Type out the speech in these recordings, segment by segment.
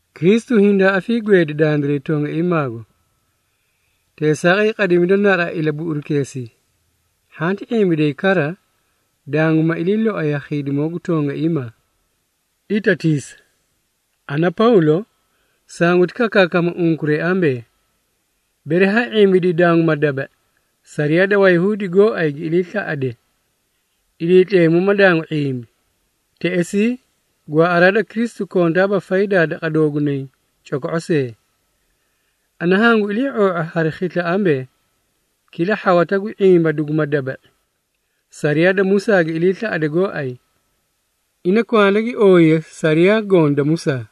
Kristu hindaa afiigweedi dandiray tongaiimaago. Teesaaqay, qadimida naraꞌa ilabuꞌurukeesii, hhanti ⁄imbiday kara, danguma ilii loay ha khiidimoo gu tongaiimaa. Itatiisa! Ana Pawlo, sanguti kakaakama unkuray ambee, bere ha ⁄imbiday danguma daba⁄i, sariyaa da Wayahuudi gooay gi iliislaꞌade, Iliitleemu ma dangu ⁄imbi, teꞌesii gwaaꞌaraa da Kristu kontaaba faydaa daqa doogunay coko⁄o see. Ana hangu ilii⁄oo⁄a hari khisla ambee, kila hhawata gu ⁄imba duguma daba⁄i, sariyaa da Musaa gi iliislaꞌade gooay, ina kwanda gi ooyiye sariyaa goõ da Musaa.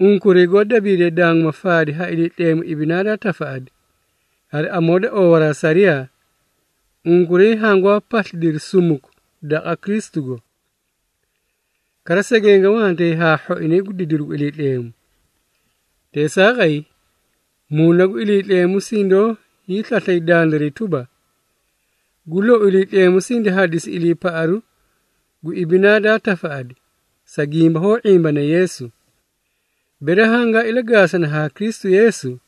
Unkuray goó dabiidee danguma faadi ha Iliitleemu ibinaa daa tafaꞌadi, hari amoo da oowaraa sariyaa, unkuray hangwaa paslidiri sumuku daqa Kristugo. Kara segenge wantay haa hhoinay gu didiru gu Iliitleemu. Teesaaqay, Muuna gu Iliitleemu sindoó hiislaslay dandiray tuba, gu lou Iliitleemu sindi hadisi iliipaꞌaru gu ibinaa daa tafaꞌadi, sa gimba hoó ⁄imbana Yeesu. Bere hangaa ilagaasani haa Kristu Yeesu,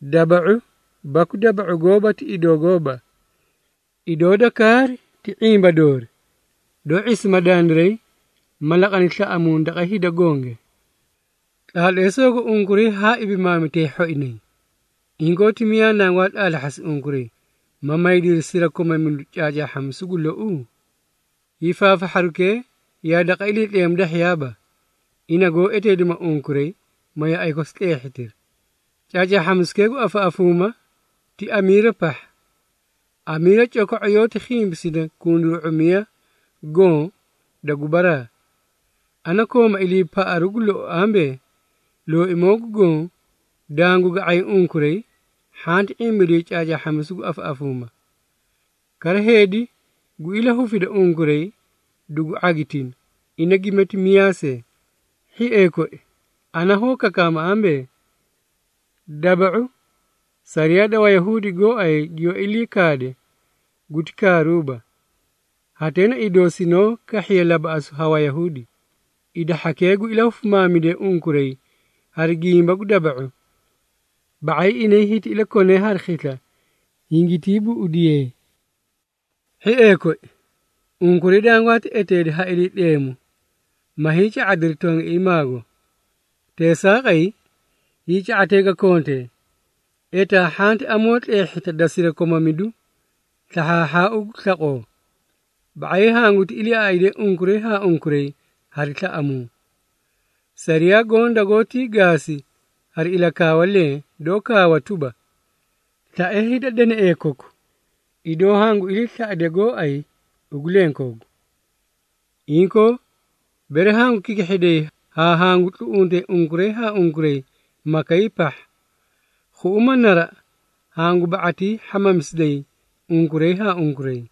daba⁄u baku daba⁄u gooba ti idoo gooba. Idoo da kaari ti ⁄imba doori doó ⁄isima dandiray ma laqani slaꞌamuu daqa hida gonge. Tlaatleesoogo unkuray haa ibimaamitay hhoinay! Inkoo, ti miyaa nangwaa tlaatlahhasi unkuray, ma maydiri sirakomamidu caacaahhamisu gu louu? Hiifaafahharukee yaa daqa Iliitleemu dahhiyaaba ina goó eteedima unkuray, ma yaꞌay kosi tleehhitiri. Caacaahhamisukee gu afaꞌafuuma ti hamiira pahha. Hamiira coko⁄o yoóti khimpisida kunduru⁄umiy goõ da gubaraa. Ana kooma iliipaꞌaru gu lou ambee, Looimoo gu Goõ dangu ga⁄ay unkuray hhanti ⁄imbiday caacaahhamisu gu afaꞌafuuma. Kara, heedi gu ilahufida unkuray dugu ⁄agitina, ina gimati miyaa see. Hhiee koi, ana hoó kakaama ambee, daba⁄u sariyaa da Wayahuudi goóay giyoó ilii kaade guti kaaruuba, hatee na idoo sinoó kahhiye labaꞌasuu ha Wayahuudi. Hida hhakee gu ilahufimaamidee unkuray hari gimba gu daba⁄u, ba⁄ay inay hiti ilakonee hari khisla hingitii buꞌudiyee! Hhiee koi, unkuray dangwaati eteedi ha Iliitleemu, ma hiica⁄adiri tongaiimaago. Teesaaqay, hiica⁄atee ga kontee, etaa hhanti amoo tleehhita da sirakomamidu slahhaahhaau gu slaqoo, ba⁄ay hanguti iliiaꞌaydee unkuray haa unkuray hari slaꞌamuu. Sariyaa goõ dagoótii gaasi hari ilakaawa lenge, doó kaawa tuba, “Slae hida danaee koku idoo hangu iliislaꞌade gooay ugu lenkoogu.” Inkoo, bere hangu kikihhiday haa hangu tluꞌuntay unkuray haa unkuray makay pahha, khuꞌuma naraꞌa hangu ba⁄atii hhamamisiday unkuray haa unkuray.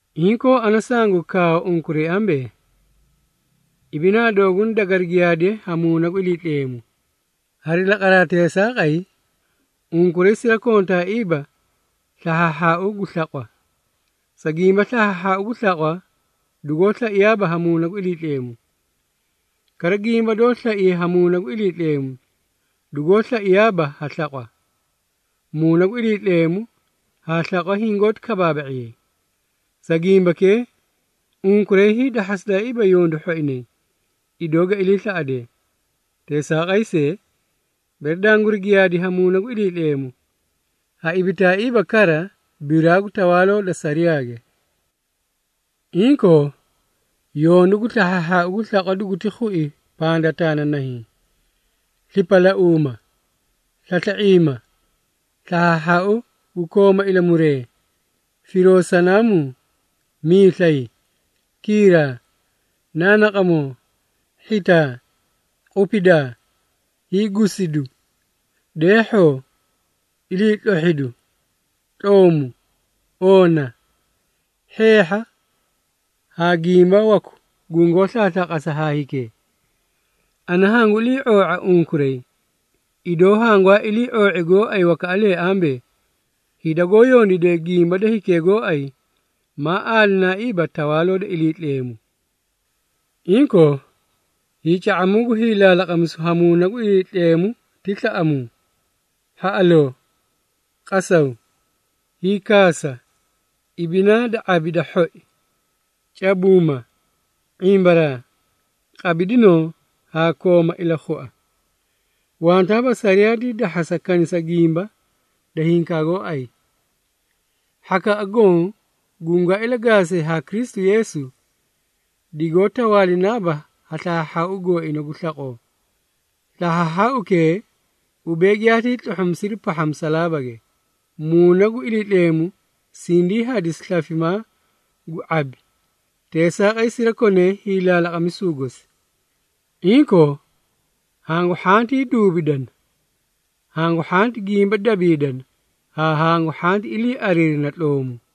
Inkoo, ana sangu kaawa unkuray ambee, ibinaa dooguna dagari giyaadiye ha Muuna gu Iliitleemu. Hari laqaraa teesaaqay, unkuray sirakontaaiiba slahhaahhaau gu slaqwa. Sa gimba, slahhaahhaau gu slaqwa dugoó slaiyaaba haa Muuna gu Iliitleemu, kara gimba doó slaiye ha Muuna gu Iliitleemu dugoó slaiyaaba ha slaqwa. Muuna gu Iliitleemu haa slaqwa hingoóti kabaaba⁄iyay. Sa gimbakee, unkuray hiidahhasidaaiiba yondu hhoinay idoo ga iliislaꞌadee. Teesaaqay see, bere danguri giyaada ha Muuna gu Iliitleemu, ha ibitaaiiba kara biraa gu tawaaloo da sariyaage. Inkoo, yondu gu slahhaahhaau gu slaqwa duguti khui pandataa na nahiĩ, slipalauuma, slasla⁄iima, slahhaahhaau gu kooma ilamuree, firoo sanaamuu, miislay, kiiraa, naanaqamoo, hhitaa, qupidaa, hiigusidu, deehhoo, iliitlohhidu, tloomu, oona, hheehha haa gimba waku gungoó slaaslaaqasa haa hikee. Ana hangu iliioo⁄a unkuray, idoo hangwaa iliioo⁄i gooay wakaꞌalee ambee, hida goó yondiidee gimba da hikee gooay, maa aalinaaiiba Tawaaloo da Iliitleemu. Inkoo, hiica⁄amuu gu hiilaalaqamisu ha Muuna gu Iliitleemu ti slaꞌamuu, hhaꞌaloo, qasaw, hiikaasa, ibinaa da ⁄abi da hhoi, cabuuma, ⁄imbaraa, qabidinoo haa ilakhua. Wantaaba sariyaa dii dahhasa kanisa gimba da hinkaa gooay. Hhakaꞌa goõ gungaa ilagaasee haa Kristu Yeesu, digoó tawaalinaaba ha slahhaahhaau gooina gu slaqoo. Slahhaahhaaukee ubee giyaatii tluhhumisiri pahha musalaabage. Muuna gu Iliitleemu sindii hadisi slafimaa gu ⁄abi, teesaaqay sirakonee hiilaalaqamisu gosi. Inkoo, hangu hhantii duubidana, hangu hhanti gimba dabiidana haa hangu hhanti iliiariirina tloomu.